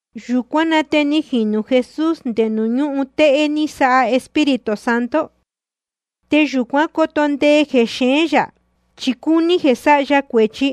Yūcuán na te ni jinū Jesús nde nuū ñúhun téhé ní sáha Espíritu Santo. Te yūcuán coto ndee jexeén yā, chi cúní jeē sáha ya cuēchi.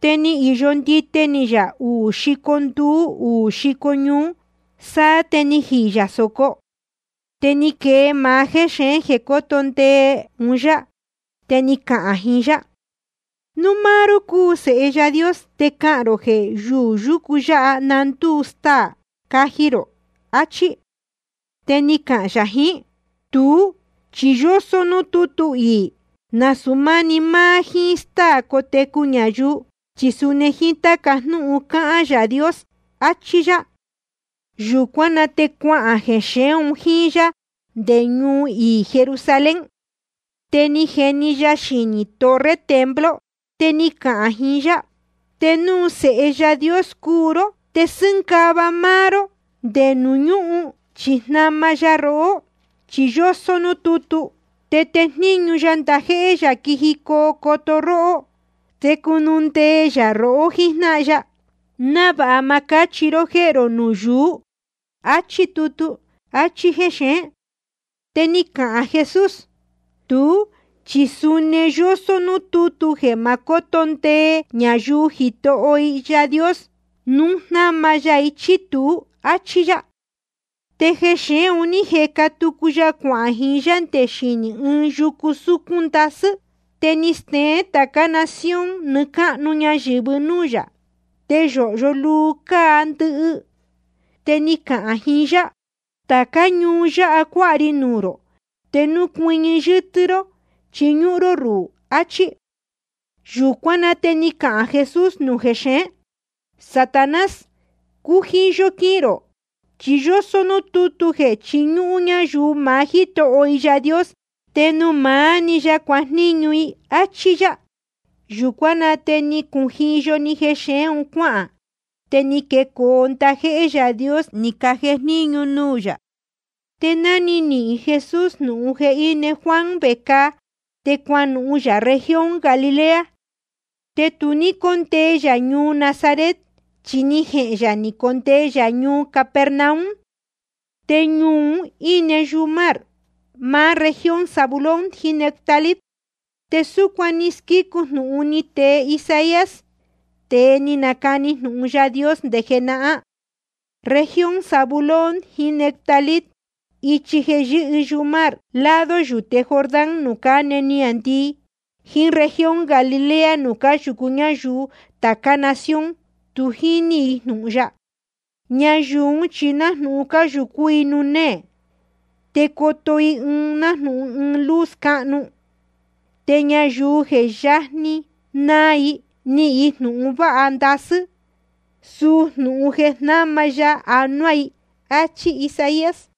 Te ni īyo ndite ni yā uū xico nduú uū xico ñuú, sáá te jíí yā sōco. Te ni quee maá jéxeén jeē cóto ndee un yá, te ni cahān jiín yá: Núu máá ró cúu Sēhe Yaā Dios, te cahān rō jeē yuū yúcu yáha na ndúu staā caji rō, achí. Te ni cahān yā jiín: Tuú chi yósó núū tútu iī: Nasūu máni máá jíín stáā cátecu ñayuu, chi suni jíín táca jnúhun cáhán Yaā Dios, achí yá. Yūcuán na te cuahān jexeén un jíín yá nde ñuu iī Jerusalén. Te ni jeni ya xinī torre templo. Te ni cahān jiín yá: Te núu Sēhe Yaā Dios cúu ró, te sɨ́ngava ró máá ró nde nuū ñúhun, chi jnama ya rohó. Chi yósó núū tútu: Tejníñu ya ndajéhé yā quijicoo coto róhó. Te cunundee yā rohó jíjnáhan ya, návāha ma cáchihi ró jéhē rō nuū yuú. Achí tutu. Achí jexeén. Te ni cahān Jesús: Tuú chi suni yósó núū tútu jeē ma cóto ndee ñayuu Jitoho i Yaā Dios, núu jnama ya i chí tuú, áchí yá. Te jexeén un ní jeca tucu ya cuahān jiín yá nde xinī ɨɨn yucu súcún ndasɨ́. Te ni steén tācá nación nɨɨ́ cáhnu ñayɨ̄vɨ núū yā, te yōhyo luu cáa ndɨhɨ. Te ni cahān jiín yá: Tācá ñuu yáha cuáha ri nuū rō, te núu cuɨñɨ yɨ́tɨ́ ró chiñúhún ró ruhū, achí. Yūcuán na te ni cahān Jesús nuū jexeén: Satanás, cujiyo quihīn rō, chi yósó núū tútu jeē chiñúhún ñayuu maá Jítoho i Yaā Dios, te nuū maá‑ni ya cuajníñu i. Achí yá. Yūcuán na te ni cujiyo‑ni jexeén un cuáhān. Te ni quecoo ndajéhé Yaā Dios ni cajejníñu nuū yā. Te ná ni nihīn Jesús jnūhun jeē íne Juan vecāa, te cuanuhun yā región Galilea. Te tu ní cóndee yā ñuu Nazaret, chi ni jehēn yā ni condee yā ñuu Capernaum. Te ñuu un íne yumar, máá región Zabulón jiín Neftalí. Te súcuan ni squícu jnūhun ni tee Isaías, tēe ni nacani jnūhun Yaā Dios nde jenahán: Región Zabulón jiín Neftalí, ichi jeē yɨ́hɨ yumar, lado yūte Jordán nuū cáne niāndii, jíín región Galilea nuū cáyūcú ñayuu tācá nación tu jíní jnūhun ya. Ñayuu ún chi nájnūhun cáyūcú i nuū néē, te coto i nájnūhun ɨɨn luz cáhnu. Te ñayuu je yajni naa, nihīn i jnūhun váha ndasɨ́, suu jnūhun jeē jnama ya anuá i. Achí Isaías.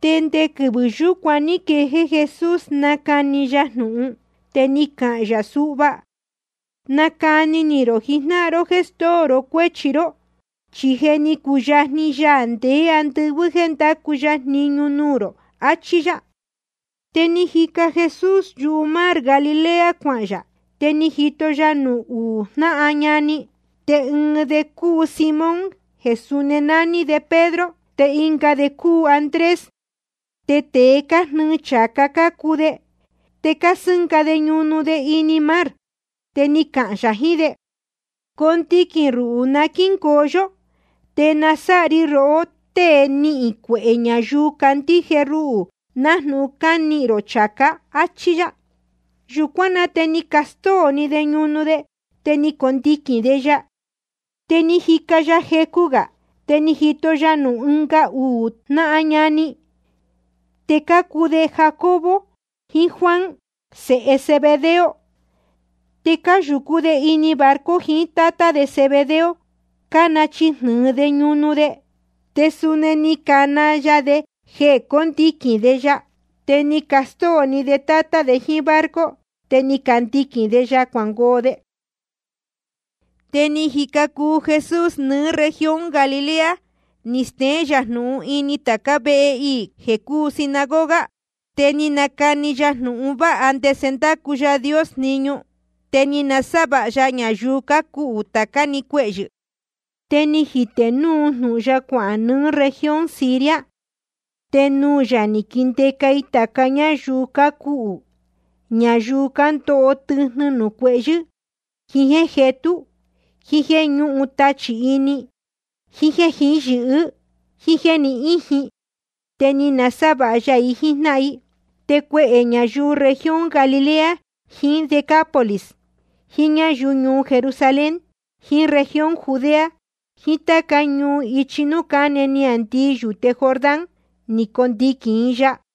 Te nde quɨvɨ̄ yúcuan ní quejéé Jesús nácani ya jnūhun, te ni cahān yā suhva: Nacani ni rō jijnáhan ró jéē stóo ró cuéchi ró, chi je ni cuyajni Yaā ndeé andɨvɨ́ jéē ndacu ya jniñu nuū rō, achí yá. Te jíca Jesús yumar Galilea cuahān yā. Te ni jito ya nuū uú jnáhan ñani. Te ɨɨn de cúu Simón jeē suni nání Pedro, te ɨnga de cúu Andrés. Te tēe cájnɨɨ chācá cácuu de, te cásɨ́nga de ñunu de ini mar. Te ni cahān yā jiín de: Condiquīn ruhū na quíhín yō, te nasáha ri rohó tée nihīn cuehē ñayuu candíje ruhū, nájnūhun cánihīn rō chācá, áchí yá. Yūcuán na te ni castóo‑ni de ñunu de, te ni candiquīn de ya. Te ni jica ya jecu gā, te ni jito ya nuū ɨnga uū jnáhan ñani. Te cácuu de Jacobo jiín Juan, sēhe Zebedeo. Te cáyūcú de ini barco jiín tátá de Zebedeo, cánachijnɨ̄ɨ de ñunu de. Te suni ni cana ya de jeē cóndiquīn de ya. Te ni castóo‑ni de tátá de jíín barco, te ni candiquīn de ya cuangoo de. Te ni jica cuu Jesús nɨɨ́ región Galilea, ni steén yā jnūhun ini tācá vehe iī jeē cúu sinagoga. Te ni nacani ya jnūhun vāha ndese ndácu Yaā Dios jniñu. Te ni nasávāha ya ñayuu cácuhū tācá‑ni cuehyɨ̄. Te ni jitē núu jnūhun ya cuahān nɨɨ́ región Siria. Te nuū yā ni caquindeca i tāca ñáyuu cácuhū, ñayuu cándoho tɨjnɨ nuū cuehyɨ́, jiín jéē jetú, jíín jéē ñúhun tachī ini, jiín jéē jihí yɨ̄hɨ́, jíín jéē ni íjin. Te ni nasávāha ya i jíjnáhan i. Te cuehē ñayuu región Galilea jiín Decápolis, jiín ñáyuu ñuu Jerusalén jiín región Judea, jiín táca ñuu ichi núū cáne niāndii yūte Jordán, ni cacondiquīn i ya.